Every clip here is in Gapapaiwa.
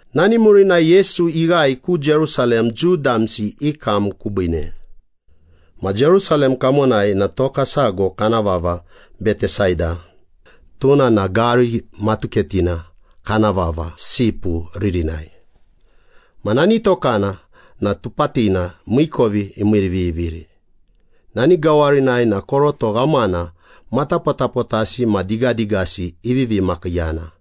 Nani murinai Yesu ighae ku Jerusalem Jiu damsi i kam kubiine. Ma Jerusalem kamonai na toka sago kana vava Betesada, tuna na gari matuketina kana vava ‘Sipu’ ririnai. Ma nani tokana na tupatina miikovi imiiriviviri. Nani gawarinai na koroto ghamana matapotapotasi ma digadigasi ivivi makiiyana.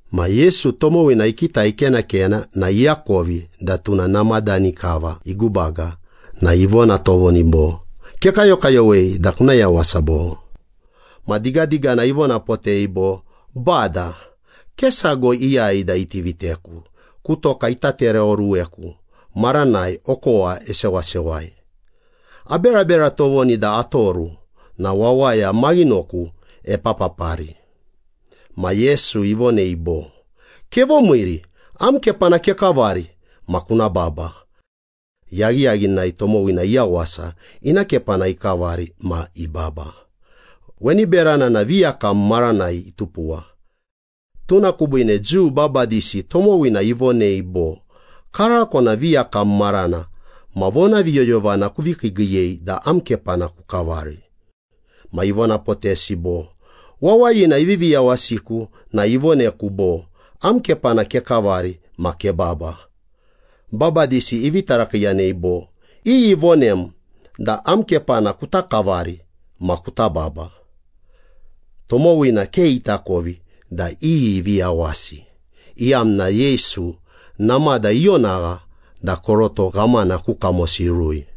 Ma Yesu tomowina ikitai ikenakena na iakovi da tuna namadani kava igubaga na ivona tovoni bo, “Kekayokayowei da kuna yawasa, bo?” Ma digadigana ivonapotei bo, “Bada, ke sago iyai da iti viteku ku toka ita tereoruweku maranai okowa isewasewai. Aberabera tovoni da atoru na wawaya maghinoku epapapari.” Ma Yesu ivonei bo, “Kevomiiri, am kepana kekavari ma kuna baba.” Yaghiyaghinai tomowina iyawasa, ina kepana ikavari ma ibaba. Weni berana na viyakam maranai itupuwa. Tuna kubiine Jiu babadisi tomowina ivonei bo, “Karako na viyakam marana ma vonaviyoyovana kuvi kiigiiyei da am kepana kukavari.” Ma ivonapotesi bo, “Wawayina ivivi yawasiku na ivoneku bo, ‘Am kepana kekavari ma kebaba.’” Babadisi ivi tarakiiyanei bo, “Iyi ivonem da am kepana kuta kavari ma kuta baba?” Tomowina ke itakovi da iyi ivi yawasi, iyamna Yesu namada ionagha da koroto ghamana ku kamosi irui.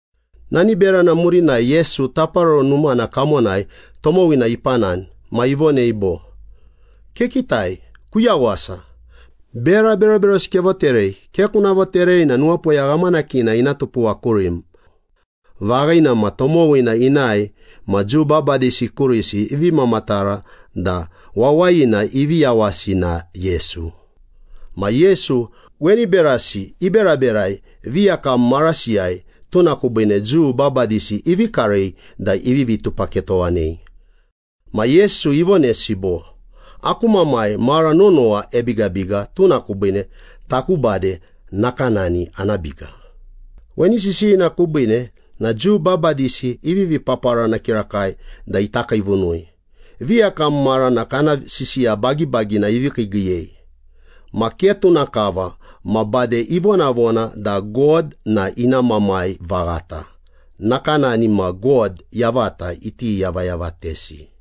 Nani berana murinai Yesu Taparoro Numana kamonai tomowina ipanani. Ma ivonei bo, “Kekitai, kuyawasa. Bera beroberosi kevoterei. Ke kuna voterei na nuwapoya ghamanakina ina tupuwa kurim.” Vaghina ma tomowina inae ma Jiu babadisi kurisi ivi mamatara da wawayina ivi yawasi na Yesu. Ma Yesu weni berasi iberaberai viyakam marasiyai, tuna kubiine Jiu babadisi ivi karei da ivivi tupaketowanei. Ma Yesu ivonesi bo, “Aku Mamai mara nonowa ebigabiga, tuna kubiine taku bade nakanani ana biga.” Weni sisiyina kubiine na Jiu babadisi ivivi paparana kirakai da ita kiivunui. Viyakam marana kana sisiya bagibagina ivi kiigiiyei ma ke tuna kava, ma bade ivonavona da God na ina Mamai vaghata, nakanani ma God yavata iti yavayavatesi.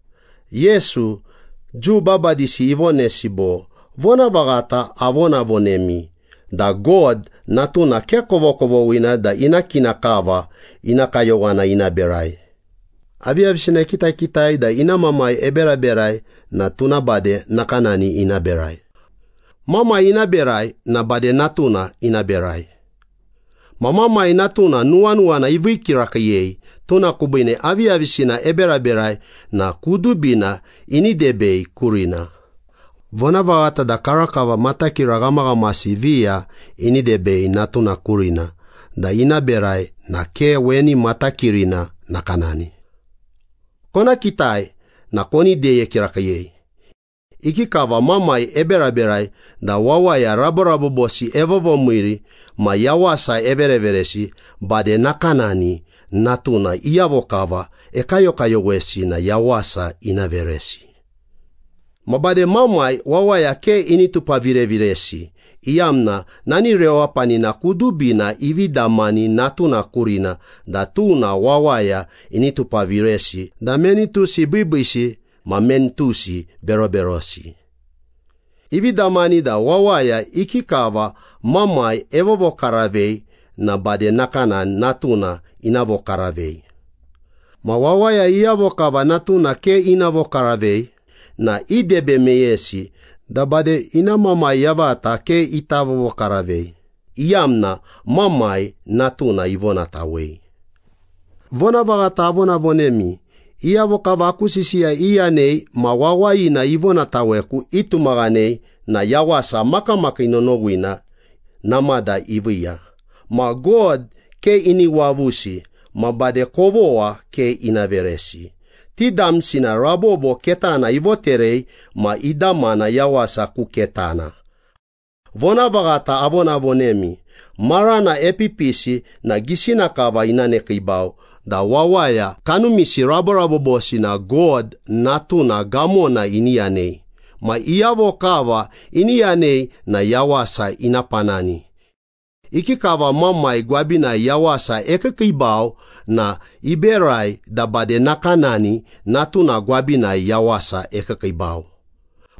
Yesu, Jiu babadisi ivonesi bo, “Vonavaghata avonavonemi da God Natuna ke kovokovoghina da ina kina kava ina kayowana ina berai. Aviyavisina ekitakitai da ina Mamai eberaberai na tuna bade nakanani ina berai. Mamai ina berai na bade Natuna ina berai. Ma Mamai Natuna nuwanuwana ivii kirakiiyei, tuna kubiine aviyavisina eberaberai na kudubina ini debei kurina. Vonavaghata da karakava matakira ghamaghamasi viya ini debei Natuna kurina da ina berai na ke weni matakirina nakanani. Kona kitai na koni deye kirakiiyei. Ikikava Mamai eberaberai da wawaya raborabobosi evovomiiri ma yawasa evereveresi, bade nakanani Natuna iyavo kava ekayokayowesi na yawasa ina veresi. Ma bade Mamai wawaya ke ini tupaviraviresi, iyamna nani rewapanina kudubina ivi damani Natuna kurina da tuna wawaya ini tupaviresi da meni tusi biibiisi ma meni tusi beroberosi. Ivi damani da wawaya ikikava Mamai evovokaravei na bade nakanani Natuna ina vokaravei. Ma wawaya iyavo kava Natuna ke ina vokaravei na idebe meyesi da bade ina Mamai yavata ke ita vovokaravei, iyamna Mamai, Natuna ivonatawei.” “Vonavaghata avonavonemi, iyavo kava aku sisiya iyanei ma wawayina ivonataweku itumaghanei na yawasa makamakii nonowina namada iviiya ma God ke ini wavusi ma bade kovogha ke ina veresi. Ti damsi na rabobo ketana ivoterei ma idamana yawasa ku ketana. Vonavaghata avonavonemi, marana epipisi na gisina kava ina nekiibau da wawaya kanumisi raborabobosi na God Natuna gamona ini yanei. Ma iyavo kava ini yanei na yawasa ina panani. Ikikava Mamai gwabinai yawasa ekiikiibau na iberai da bade nakanani Natuna gwabinai yawasa ekiikiibau.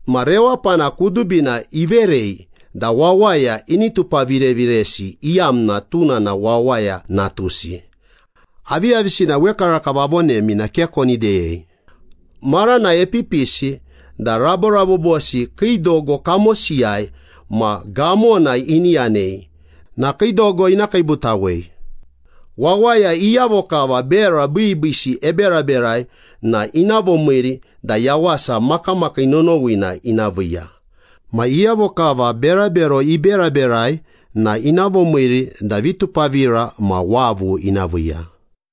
Ma rewapana kudubina iverei da wawaya ini tupaviraviresi, iyamna tuna na Wawaya Natusi. Aviyavisina wekarakava avonemi na ke koni deyei. Marana epipisi da raborabobosi kii dogo kamosiyai ma gamona ini yanei, na kii dogo ina kiibutawei. Wawaya iyavo kava bera biibiisi iberaberai na ina vomiiri da yawasa makamakii nonowina ina viiya. Ma iyavo kava berabero iberaberai na ina vomiiri da vitupavira ma wavu ina viiya.”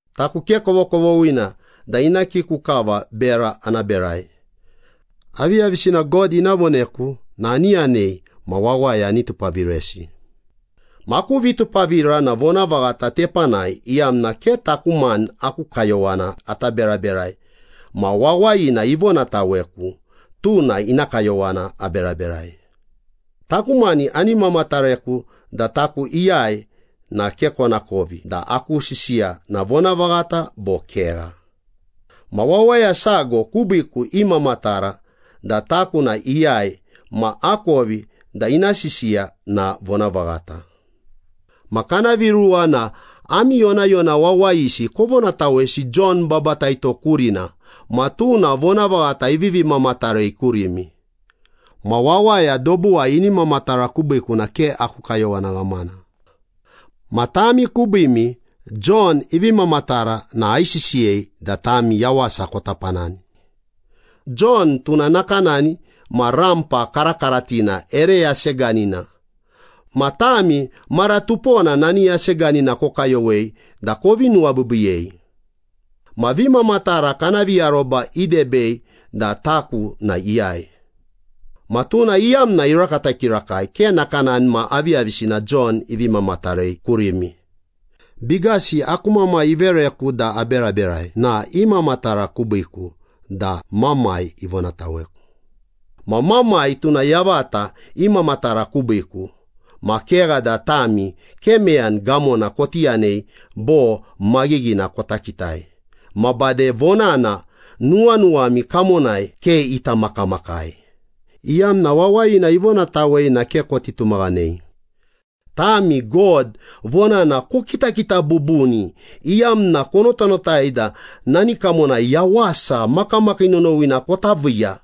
“Taku ke kovokovoghina da ina kiku kava bera ana berai. Aviyavisina God ina voneku na ani yanei ma wawaya ani tupaviresi. Ma aku vitupavira na vonavaghata tepanai, iyamna ke taku mani aku kayowana ata beraberai ma Wawayina ivonataweku, tuna ina kayowana aberaberai.” “Taku mani ani mamatareku da taku iyai na ke konakovi da aku sisiya na vonavaghata bo kegha. Ma Wawaya sago kubiiku imamatara da taku na iyai ma akovi da ina sisiya na vonavaghata. Ma kana viruwa na ami yonayona wawayisi kovonatawesi Jon Babataito kurina ma tuna vonavaghata ivi mamatarei kurimi. Ma wawaya dobuwai ini mamatara kubiiku na ke aku kayowana ghamana. Ma tami kubiimi Jon ivi mamatara na aisisiyei da tami yawasa kota panani. Jon tuna nakanani ma rampa karakaratina ere yaseganina. Ma tami mara tupona nani yaseganina kokayowei da kovi nuwabiibiiyei. Ma vimamatara kana viaroba idebei da taku na iyai. Ma tuna iyamna irakata kirakai, ke nakanani ma aviyavisina Jon ivi mamatarei kurimi. Bigasi aku Mamai ivereku da aberaberai na imamatara kubiiku da Mamai ivonataweku. Ma Mamai tuna yavata imamatara kubiiku. Ma kegha da tami ke meyani gamona koti yanei bo maghighina kota kitai, ma bade vonana nuwanuwami kamonai ke ita makamakai, iyamna wawayina ivonatawei na ke koti tumaghanei. Tami God vonana kokitakita bubuni iyamna konotanotai da nani kamonai yawasa makamakii nonowina kota viiya.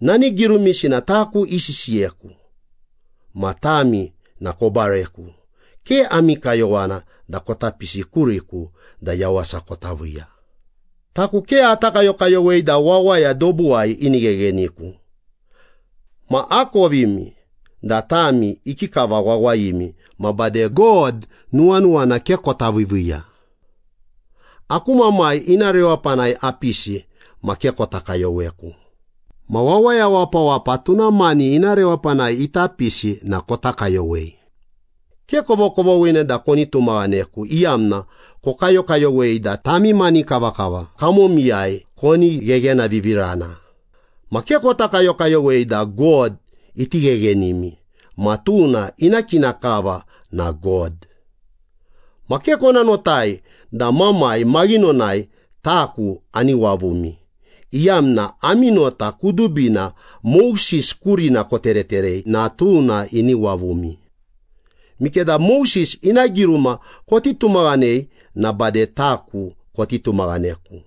Nani girumisi na taku isisiyeku, ma tami na kobareku. Ke ami kayowana da kota pisi kuriku da yawasa kota viiya.” “Taku ke ata kayokayowei da wawaya dobuwai ini ghegheniku. Ma akovimi da tami ikikava wawayimi ma bade God nuwanuwana ke kota viiviiya. Aku Mamai ina rewapanai apisi, ma ke kota kayoweku. Ma wawaya wapawapa tuna mani ina rewapanai ita pisi na kota kayowei. Ke kovokovoghina da koni tumaghaneku, iyamna kokayokayowei da tami mani kavakava kamomiyai koni gheghenavivirana. Ma ke kota kayokayowei da God iti gheghenimi, ma tuna ina kina kava na God. Ma ke kona notai da Mamai maghinonai taku ani wavumi, iyamna ami nota kudubina Moses kurina kotereterei na tuna ini wavumi. Mikeda Moses ina giruma koti tumaghanei na bade taku koti tumaghaneku,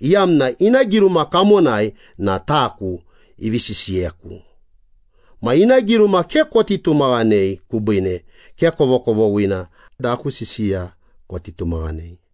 iyamna ina giruma kamonai na taku ivi sisiyeku. Ma ina giruma ke koti tumaghanei kubiine, ke kovokovoghina da aku sisiya koti tumaghanei.”